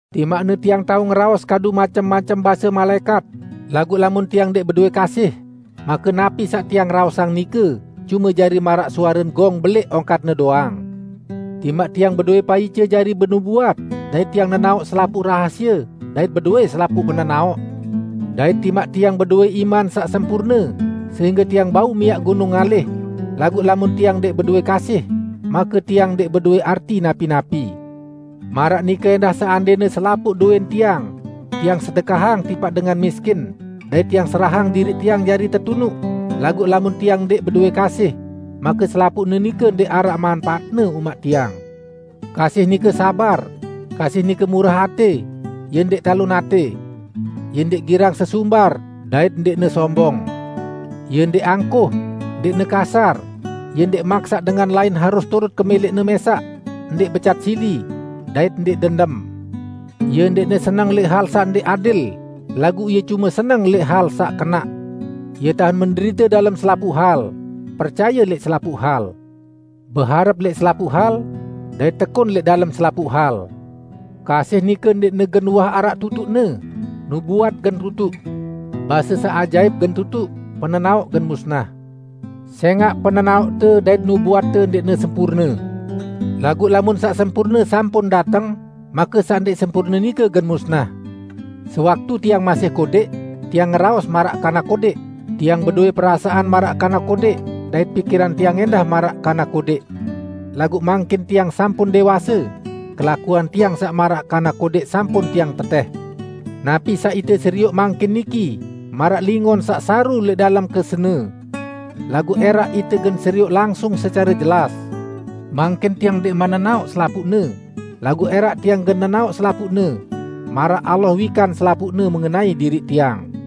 Timaqne tiang tao ngeraos kadu macem-macem base malaẽkat, laguq lamun tiang ndẽq bedowẽ kasih, make napi saq tiang raosang nike cume jari maraq suaren gong beléq ongkatne doang. Timaq tiang bedowẽ paice jari benubuat dait tiang nenaoq selapuq rahasie dait bedowẽ selapuq penenaoq, dait timaq tiang bedowẽ iman saq sempurne sehingge tiang bau miaq gunung ngalih, laguq lamun tiang ndẽq bedowẽ kasih, make tiang ndẽq bedowẽ arti napi-napi! Maraq nike ẽndah seandẽne selapuq dowẽn tiang, tiang sedekahang tipaq dengan miskin, dait tiang serahang diriq tiang jari tetunuq, laguq lamun tiang ndẽq bedowẽ kasih, make selapuqne nike ndẽq araq manpaatne umaq tiang. Kasih nike sabar, kasih nike murah atẽ, ie ndẽq talon atẽ. Ie ndẽq girang sesumbar, dait ndẽqne sombong. Ie ndẽq angkuh, ndẽqne kasar, ie ndẽq maksaq dengan lain harus turut kemẽlẽqne mẽsaq, ndẽq becat sili, dait ndẽq dendem. Ie ndẽqne seneng lẽq hal saq ndẽq adil, laguq ie cume seneng lẽq hal saq kenaq. Ie tahen menderite dalem selapuq hal, percaye lẽq selapuq hal, beharep lẽq selapuq hal, dait tekun lẽq dalem selapuq hal. Kasih nike ndẽqne gen uwah araq tutuqne, nubuat gen tutuq. Base saq ajaip gen tutuq, penenaoq gen musnah. Sẽngaq penenaoqte dait nubuatte ndẽqne sempurne. Laguq lamun saq sempurne sampun dateng, make saq ndẽq sempurne nike gen musnah. Sewaktu tiang masih kodẽq, tiang ngeraos maraq kanak kodẽq, tiang bedowẽ perasaan maraq kanak kodẽq dait pikiran tiang ẽndah maraq kanak kodẽq. Laguq mangkin tiang sampun dẽwase, kelakuan tiang saq maraq kanak kodẽq sampun tiang tetẽh. Napi saq ite serioq mangkin niki maraq lingon saq saru lẽq dalem kesene. Laguq ẽraq ite gen serioq langsung secare jelas. Mangkin tiang ndẽqman nenaoq selapuqne, laguq ẽraq tiang gen nenaoq selapuqne, maraq Allah wikan selapuqne mengenai diriq tiang.